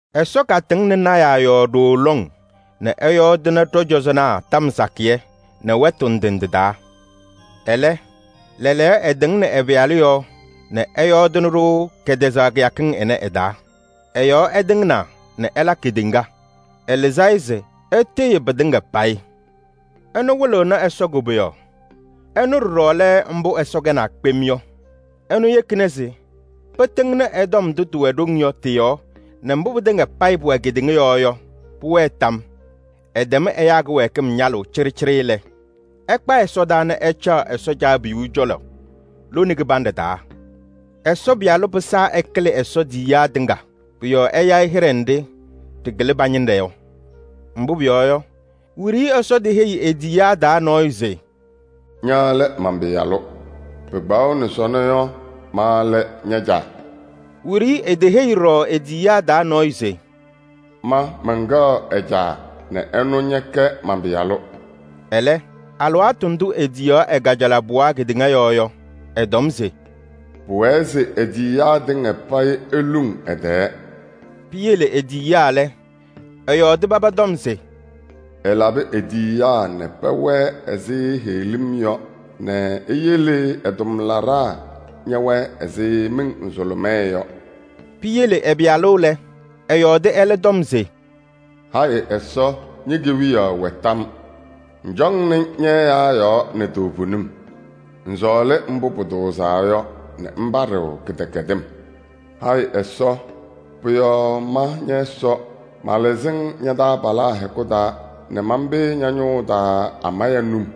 Ɛsɔ katɩŋnɩ lɔɔyɩsɩ tɩnaa yɔɔ ɖooo lɔŋ nɛ ɛyɔɔdɩnɩ ɖɔ-cɔzɔnaa tɔm sakɩyɛ nɛ wɛtʋ ndɩ ndɩ taa. Ɛlɛ, lɛɛlɛɛyɔ ɛtɩŋnɩ ɛ-Pɩyalʋ yɔɔ nɛ ɛyɔɔdɩnɩ-ɖʋ kɛtɛzaɣ kɩyakɩŋ ɩnɛ ɩ-taa. Ɛ-yɔɔ ɛtɩŋnaa nɛ ɛla kedeŋa. Ɛlɩzɩ-ɩ se ɛtɩɣyɩ pɩtɩŋa payɩ. Ɛnʋ wɩlɩɣnɩ Ɛsɔ koboyaɣ. Ɛnʋ ɖɔɖɔ lɛ mbʋ Ɛsɔ kɛnaa kpem yɔ. Ɛnʋ yekina se pɩtɩŋnɩ ɛ-tɔm ndʋ tɩwɛ ɖoŋ yɔ tɩ-yɔɔ nɛ mbʋ pɩtɩŋa payɩ pʋwɛ kedeŋa yɔɔ yɔ, pʋwɛɛ tam. Ɛtɛm ɛyaa kɩwɛɛkɩm ñalʋʋ cɩɖɩcɩɖɩ lɛ, ɛkpa ɛsɔdaa nɛ ɛcaɣ Ɛsɔ Caabiyuu cɔlɔ lone kɩbanɖɛ taa. Ɛsɔ Pɩyalʋ pɩsaa ɛkɩlɩ Ɛsɔ tiyiyaa tɩŋa. Pʋ-yɔɔ ɛya-ɩ hɩɖɛ nɖɩ ɖɩkɩlɩ pa-ñɩnɖɛ yɔ. Mbʋ pʋyɔɔ yɔ, wiɖiyi Ɛsɔ teheyi e-tiyiyaa taa nɔɔyʋ se: “Ña lɛ man-Pɩyalʋ. Pɩkpaɣʋnɩ sɔnɔ yɔ, ma lɛ ña-Caa.” Wiɖiyi eteheyi ɖɔɖɔ e-tiyiyaa taa nɔɔyʋ se: “Ma mɛnkɛɣ ɛ-Caa nɛ ɛnʋ ñɛkɛ man-Pɩyalʋ.” Ɛlɛ, alɩwaatʋ ndʋ etiyaɣ ɛ-kajalaɣ pɩɣa kedeŋa yɔɔ yɔ, ɛtɔm se: “Pʋwɛɛ se e-tiyiyaa tɩŋa payɩ eluŋ kɛ-tɛɛ.” Piyele e-tiyiyaa lɛ, ɛyɔɔdɩ paba tɔm se: “Ɛlabɩ e-tiyiyaa nɛ pɛwɛɛ ɛzɩ heɣlim yɔ nɛ eyele ɛ-tʋmlaɖaa ñɛwɛɛ ɛzɩ miŋ nzʋlʋmɛɛ yɔ.” Piyele ɛ-Pɩyalʋ lɛ, ɛyɔɔdɩ ɛlɛ tɔm se: “Hayɩ Ɛsɔ! Ñe-kewiyaɣ wɛ tam yɔɔ. Ŋcɔŋnɩ ñɛ-ɛyaa yɔɔ nɛ toovenim. Ŋsɔɔlɩ mbʋ pʋtʋʋzaa yɔ nɛ ŋpaɖɩɣ kɩdɛkɛdɩm. Hayɩ Ɛsɔ! Pʋ-yɔɔ ma ñɛ-Ɛsɔ malɩzɩ-ŋ ña-taabalaa hɛkʋ taa nɛ manpɩyɩ ña-ñʋʋ taa amaya num.”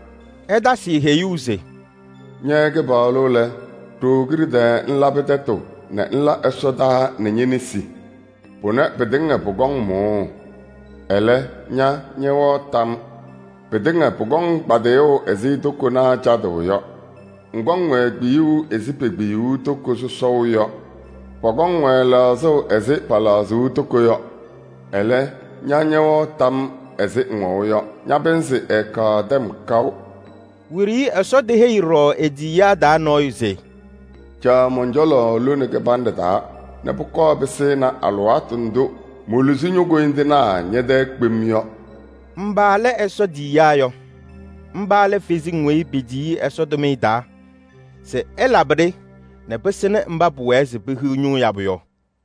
Ɛtasɩ-ɩ heyuu se: “Ña Kɩpaɣlʋ lɛ, ɖooo kiɖe tɛɛ ŋlabɩ tɛtʋ nɛ ŋla ɛsɔtɔnʋʋ nɛ ñe-nesi. Pʋnɛ pɩtɩŋa pʋkɔŋ mʋʋ. Ɛlɛ, ña ñɛwɛɣ tam yɔɔ. Pɩtɩŋa pʋkɔŋ kpadɩyʋʋ ɛzɩ tokonaa cadʋʋ yɔ. Ŋkɔŋ-wɛ kpiyuu ɛzɩ pekpiyuu toko sɔsɔʋ yɔ. Pɔkɔŋ-wɛ lɛɣzʋʋ ɛzɩ pɛlɛɣzʋʋ toko yɔ. Ɛlɛ, ña ñɛwɛɣ tam ɛzɩ ŋwɛʋ yɔ, ña-pɩnzɩ ɛɛkaɣ tɛm kaʋ.” Wiɖiyi Ɛsɔ teheyi ɖɔɖɔ e-tiyiyaa taa nɔɔyʋ se: “Caɣ mɔn-cɔlɔ lone kɩbanɖɛ taa nɛ pʋkɔɔ pɩsɩnɩ alɩwaatʋ ndʋ moluzi ño-koyindinaa ñɛ-tɛɛ kpem yɔ.” Mba lɛ Ɛsɔ tiyiyaa yɔ? Mba lɛ kalɩzasɩ nzɩ petiyi-sɩ Ɛsɔ tʋmɩyɛ taa se sɩlabɩ-ɖɩ nɛ pɩsɩnɩ mba pʋwɛɛ se pehiɣ ñʋʋ yabʋ yɔ.